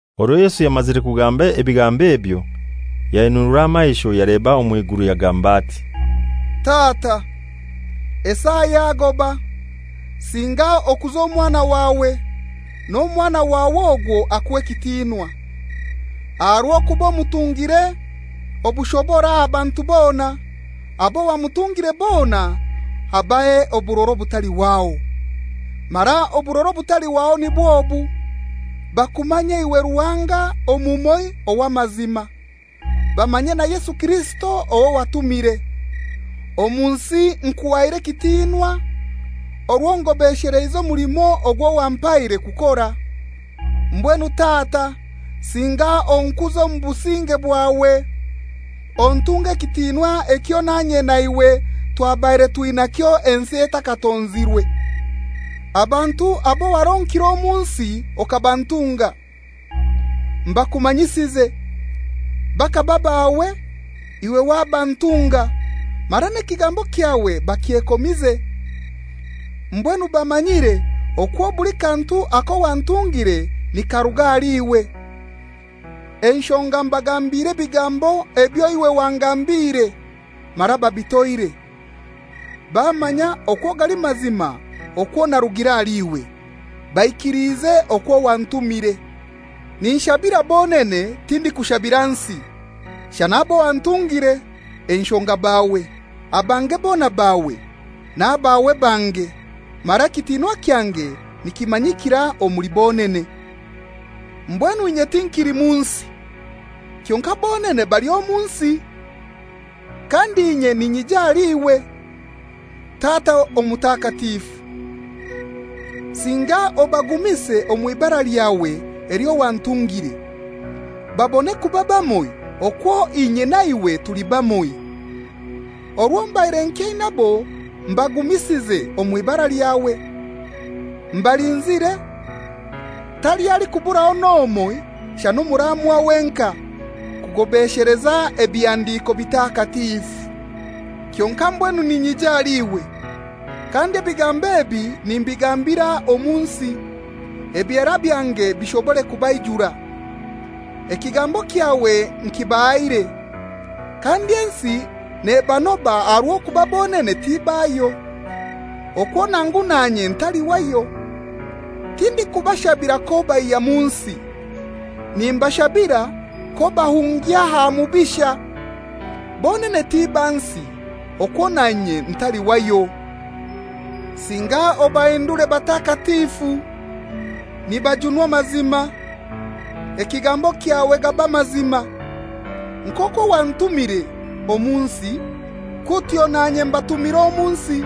Orwo Yesu yamazire kugamba ebigambo ebyo, yainunura amaisho yaleba omw'iguru, yagamba ati, «Tata, esaa yagoba. Singa okuze Omwana wawe, n'Omwana wawe ogwo akuhe ekitinwa, Aha rw'okuba omutungire obushobora aha bantu bona, abo wamutungire bona abahe oburora obutalihwaho. Mara oburora obutalihwaho nibw'obu: Bakumanye iwe Ruhanga omumoi ow'amazima, bamanye na Yesu Kirisito owo watumire. Omu nsi nkuhaire ekitinwa, orwo ngobesheleize omulimo ogwo wampaire kukora. Mbwenu Tata singa onkuze omu businge bwawe, ontunge ekitinwa ekyo nanye naiwe twabaire twinakyo ensi etakatonzirwe. «Abantu abo waronkire omu nsi okabantunga, mbakumanyisize. Bakaba baawe, iwe wabantunga, mara n'ekigambo kyawe bakyekomize. Mbwenu bamanyiire okwo buli kantu ako wantungire nikaruga ahali iwe; enshonga mbagambire ebigambo ebyo iwe wangambire, mara babitoire, bamanya n'okwo gali mazima okwo narugire ahali iwe, baikiliize okwo wantumire. Ninshabira bonene; tindikushabira nsi, shana abo wantungire, enshonga bawe. Abange bona bawe, n'abawe bange, mara ekitinwa kyange nikimanyikira omuli bonene. Mbwenu inye tinkili mu nsi, kyonkai bonene bali omu nsi, kandi inye ninyija ahali iwe. Tata Omutakatifu, singa obagumise omw'ibara lyawe elyo wantungire babone kuba bamoi okwo inye na iwe tuli bamoi. Orwo mbaire nkyainabo mbagumisize omw'ibara lyawe. Mbalinzire, taliho alikuburaho n'omoi shana omuraamwa wenkai, kugobesheleza Ebihandiko Bitakatifu. Kyonkai mbwenu ninyija ahali iwe. Kandi ebigambo ebi nimbigambira omu nsi, ebyera byange bishobore kubaijura. Ekigambo kyawe nkibahaire, kandi ensi nebanoba aha rw'okuba bonene tibayo, okwo nangu nanye ntali wayo. Tindikubashabira k'obaihya mu nsi. Nimbashabira k'obahungya aha Mubisha. Bonene ti ba nsi, okwo nanye ntali wayo. Singa obahindure batakatifu nibajunwa amazima; ekigambo kyawe gaba mazima. Nk'okwo wantumire omu nsi, kutyo nanye mbatumire omu nsi.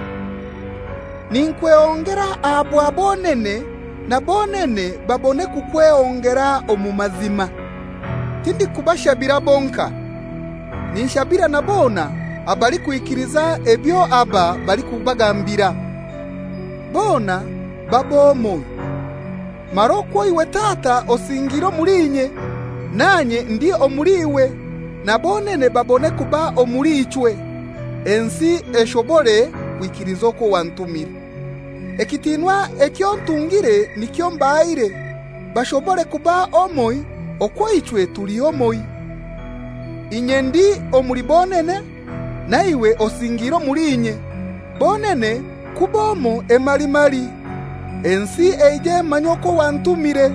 Ninkwehongera aha bwa bonene, na bonene babone kukwehongera omu mazima. «Tindikubashabira bonkai, ninshabira na bona abalikwikiliza ebyo aba balikubagambira, bona babe omoi. Mara okwo iwe Tata osingiire omuli inye, nanye ndi omuli iwe, na bonene babone kuba omuli ichwe, ensi eshobore kwikiliza okwo wantumire. Ekitinwa eky'ontungire nikyo mbahaire, bashobore kuba omoi okwo ichwe tuli omoi, inye ndi omuli bonene, na iwe osingiire omuli inye, bonene kuba omoi emalimali, ensi eije emanye okwo wantumire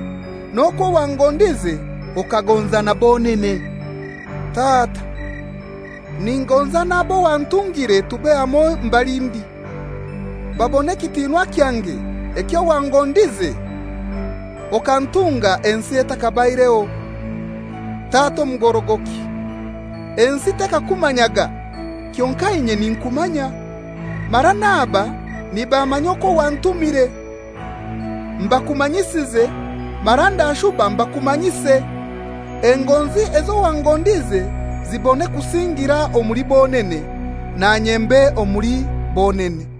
n'okwo wangondize okagonza na bonene. Tata, ningonza n'abo wantungire tube hamoi mbali ndi, babone ekitinwa kyange ekyo wangondize okantunga ensi ethakabaireho. Tata omugorogoki, ensi tekakumanyaga, kyonkai inye ninkumanya; mara n'aba nibamanya okwo wantumire. Mbakumanyisize, mara ndashuba mbakumanyise, engonzi ezo wangondize zibone kusingira omuli bonene, nanye mbe omuli bonene.»